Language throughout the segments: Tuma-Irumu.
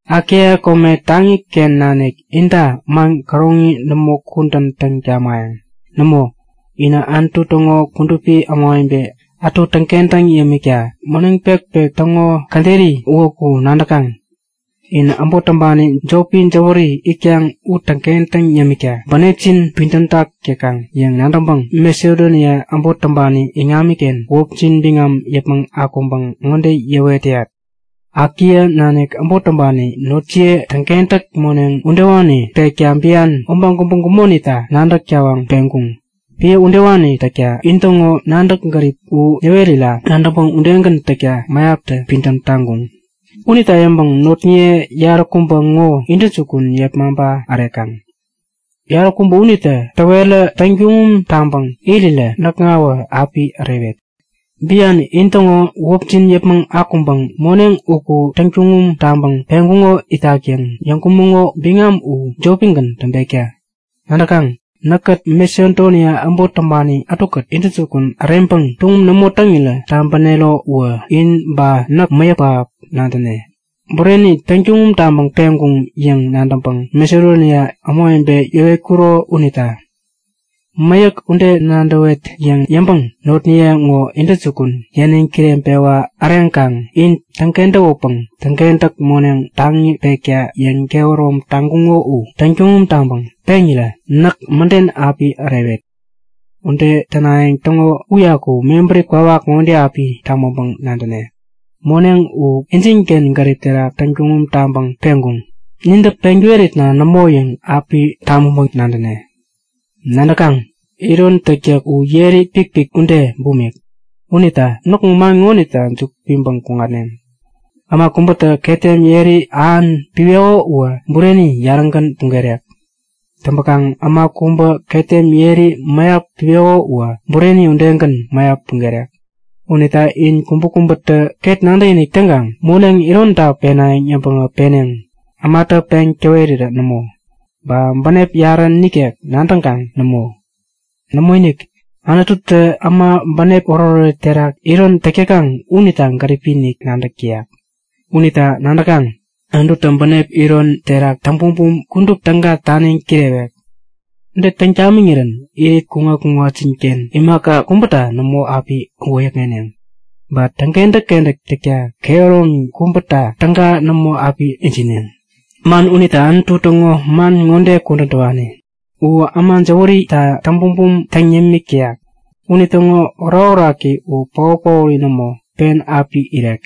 Akaia kome taŋiken nanik inta man käroŋi nämo kudän täŋ tamayäŋ. Nämo, inä Anutu täŋo kudupi ämawebe ätu täŋkentäŋ yämikta moneŋ pekpek täŋo käderi uwäku nadäkaŋ. In äbot täŋpani jopi jäwäri itkaŋ u täŋkentäŋ yämikta bänepjin pidämtak täkaŋ yäŋ nadäŋpäŋ Masedonia äbot täŋpani iŋamiken wäpjin biŋam yäpmäŋ akuŋpäŋ ŋode yäwet täyat; Akaia nanik äbot täŋpani notjiye täŋkentäk moneŋ udewani pekta bian, obaŋ kubä gumonita nadäk tawaŋ peŋkuŋ. Piä udewani täkta intäŋo nadäk-gärip u yäwerira nadäŋpäŋ udegän täkta mäyaptä pidäm taŋkuŋ. Unita yäŋpäŋ notniye yaräkubä ŋo intäjukun yepmaŋpa ärekaŋ. Yaräkubä unitä täwerä täŋtuŋum taŋpäŋ irirä näkŋawä api ärewet. Bian intäŋo wäpjin yäpmäŋ akuŋpäŋ moneŋ uku täŋtuŋum taŋpäŋ peŋkuŋo itak yäŋ yäŋkumäŋo biŋam u jopigän täŋpekta! Nadäkaŋ? Näkkät Masedonia äbot täŋpani ätukät intäjukun äreŋpäŋ tuŋum nämo täŋirä tabänero uwä in ba näk mäyäk pähap nadäne, bureni täŋtuŋum taŋpäŋ peŋkuŋ yäŋ nadäŋpäŋ Masedonia ämawebe yäwetkuro unita. Mäyäk ude nadäwet yäŋ yäŋpäŋ notnaye ŋo intäjukun yäniŋ kireŋpewa äreŋkaŋ in täŋkentäwäpäŋ täŋkentäk moneŋ taŋi pekta yäŋkehärom taŋkuŋo u täŋtuŋum taŋpäŋ peŋirä näk mäden api ärewet. Ude tänayäŋ täŋo uyaku mebäri kwawak ŋode api tabäŋpäŋ-nadäne; Moneŋ u injinken gärip terak täŋtuŋum taŋpäŋ peŋkuŋ, nintä peŋ täweritna nämo yäŋ api tabäŋpäŋ-nadäne. Nadäkaŋ? Iron täktäk u yeri pikpik ude bumik. Unita näkŋo man ŋonita juku piŋpäŋ kuŋatneŋ; Äma kubätä ketem yeri ähan piweko uwä bureni yarägän pugerek. Täŋpäkaŋ äma kubä ketem yeri mäyap piweko uwä bureni udegän mäyap pugerek. Unita in kubäkubätä ket nadäkinik täŋkaŋ moneŋ ironta penayäŋ yäŋpäŋä peneŋ, ämatä peŋ täwerirä nämo, ba bänep yarä nikek nadäŋkaŋ nämo. Nämoinik, Anututä äma bänep oretoret terak iron täk täkaŋ unita gäripi-inik nadäk täyak. Unita nadäkaŋ? Anututä bänep ironi terak täŋbumbum kudup täga taniŋ kirewek. Ude täŋ tamiŋirän irit kuŋat-kuŋatjinken imaka kubäta nämo api wäyäkŋeneŋ. Ba täŋkentäk-kentäk täkta kehäromi kubäta täga nämo api ijineŋ. Man unita Anutu täŋo man ŋode kudän täwani; U äma jäwärita täŋbumbum täŋ yämik täyak. Unitäŋo orakoraki u paot-paori nämo, pen api irek.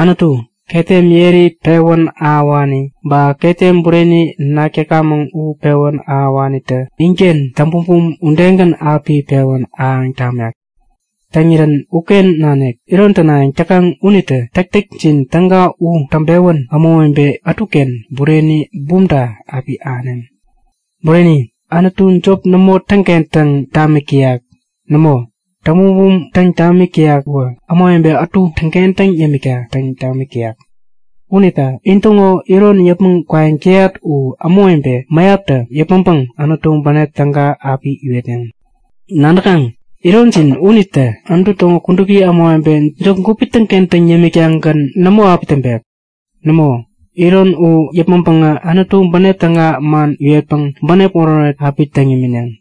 Anutu, ketem yeri pewän ahäwani ba ketem bureni nak täkamäŋ u pewän ahäwanitä inken täŋbumbum udegän api pewän ahäŋ tamek. Täŋirän uken nanik iron tänayäŋ täkaŋ unitä täktäkjin täga u täŋpewän ämawebe ätuken bureni bumta api ahäneŋ. Bureni, Anutu jop nämo täŋkentäŋ tamik täyak. Nämo, täŋbumbum täŋ tamik täyak uwä ämawebe ätu täŋkentäŋ yämikta täŋ tamik täyak. Unita intäŋo iron yäpmäŋ kwayäŋ täyat u ämawebe mäyaptä yäpmäŋpäŋ Anutu bänep täga api iwetneŋ. Nadäkaŋ, ironjin unitä Anutu täŋo kudupi ämawebe jop gupi täŋkentäŋ yämik-tagän nämo api täŋpek. Nämo, iron u yäpmäŋpäŋä Anutu bänep täga man iwetpäŋ bänep oretoret pähap api täŋ imineŋ.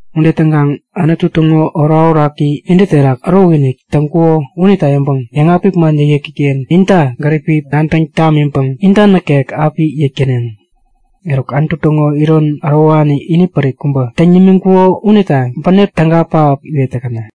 Ude täŋkaŋ Anutu täŋo orakoraki intä terak ärokinik täŋkuko unita yäŋpäŋ yäŋapik man yäkyäki-ken inta gäripi nadäŋ tamiŋpäŋ inta nikek api yäk täneŋ. Eruk Anutu täŋo iron ärowani inipärik kubä täŋ nimiŋkuko unita bänep täga pähap iwet täkäna!